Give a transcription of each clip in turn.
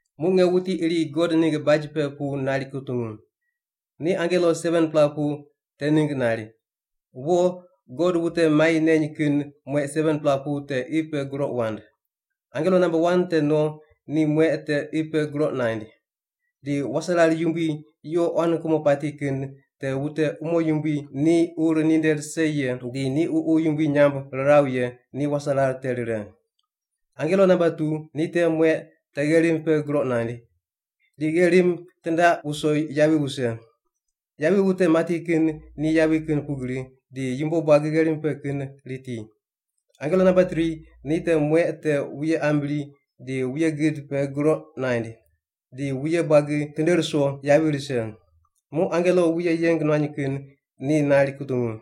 Muq nge wuti iri God ningg baj pe pu nari kutungu. Ni angelo 7-pela pu te ningg nari, “Wo, God wute mai neny kin mueq 7-pela pu te qi pe groq wand.” Angelo namba wan te no ni mueq te qi pe groq naind. Di waserar yumbui yuqo quan kumo pati kin te wute umo yumbui ni ur ninde rise ye di ni ququ yumbui nyamb riraw ye ni waserar te rire. Angelo namba tu ni te mueq te gherim pe groq naind. Di gherim tindaq wuso yavi wuse. Yavi wute mati kin ni yavi kin pugri, di yumbo buagi gherim pe kin riti. Angelo namba tri ni te mueq te wuye ambri di wuye gid pe groq naind, di wuye buagi tinde ruso yavi rise. Muq angelo wuye yeng nuany kin ni nari kutungu.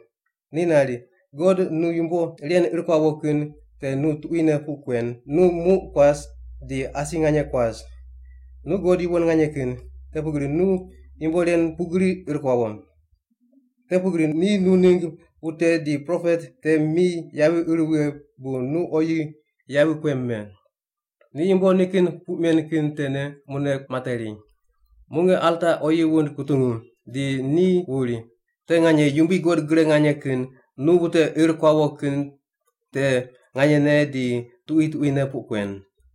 Ni nari, “God, nu yumbo ren ir kuawo kin te nu tuquine puq kuen, nu muq kuas di asi nganye kuas. Nu God yuwon nganye kin, te pugri nu yumbo ren pugri ir kuawo. Te pugri ni nu ningg wute di propet te mi yavi ir wughe bu ni oyi yavi kuem me. Ni yumbo nikin puq men kin tene mune materi.” Muq nge alta oyi wund kutungu, di ni wuri, “Te nganye, Yumbui God Gre Nganye Kin, nu wute ir kuawo kin te nganyene di tuqui tuquine puq kuen.”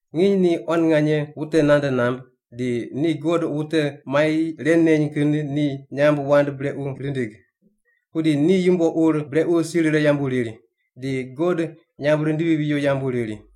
Nginy ni quan nganye wute nande namb, di ni God wute mai ren neny kin ni nyamb wand brequ rindig. Pudi ni yumbo ur brequ si rire yambu riri, di God nyamb rindiri riwo yambu riri.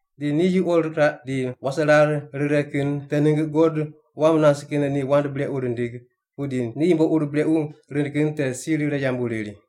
Di ni yuqo riraq di waserar rire kin te ningg God wam nas kin ni wand brequ rindig, pudi ni yumbo ur brequ rind kin te si rire yambu riri.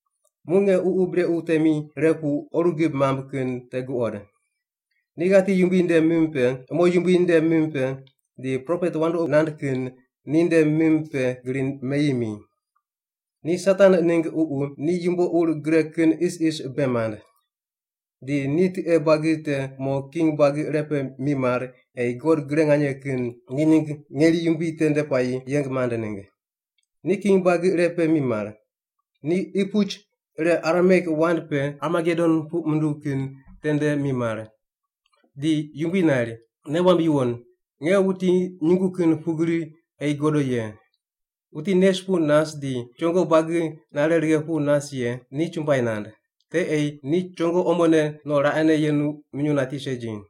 Muq nge ququ brequ temi ire pu oru gib mamb kin te guqod. Ni ghati yumbui nde mim pe, umo yumbui nde mim pe, di propet wandoqi nand kin ni nde mim pe gri meyi mi. Ni Satan ningg ququ, ni yumbo ur gre kin isis bei mand. Di ni tiqe buagi te mo king buagi irepe mimar ei God Gre Nganye Kin ni ningg ngeri yumbui tende puayi yeng mand ningg. Ni king buagi irepe mimar. Ni qi puch ire Arameik wand pe Armagedon puq munduw kin tende mimar. Di Yumbui nari, “Nei wamb yuwon, nge wuti nyungu kin pugri ei godo ye! Wuti nes pu nas di chongo buagi nare righe pu nas ye ni chumbuai nand. Te ei ni chongo omone no raqene yenu minyuw nati segi.”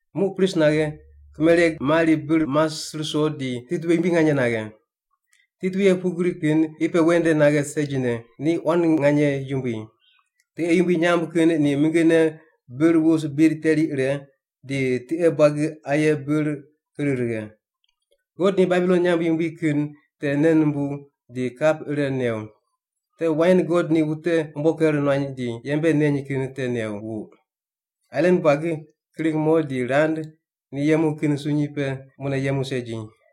Muq pris naghe, kimereg mari bir mas ruso di titwuye yumbui nganye naghe. Titwuye pugri kin qi pe ven nde naghe segine, ni quan nganye yumbui. Tiqe yumbui nyamb kin ni mingine bir wus bid teri ire, di tiqe buagi aye bir ir righe. God ni Babilon nyamb yumbui kin te nei numbuw di kap ire new. Te wain God ni wute umbo ker nuany di yembe neny kin te new wuq. Ailan buagi kring mo di rand ni yemu kin sunyi pe mune yemu segi.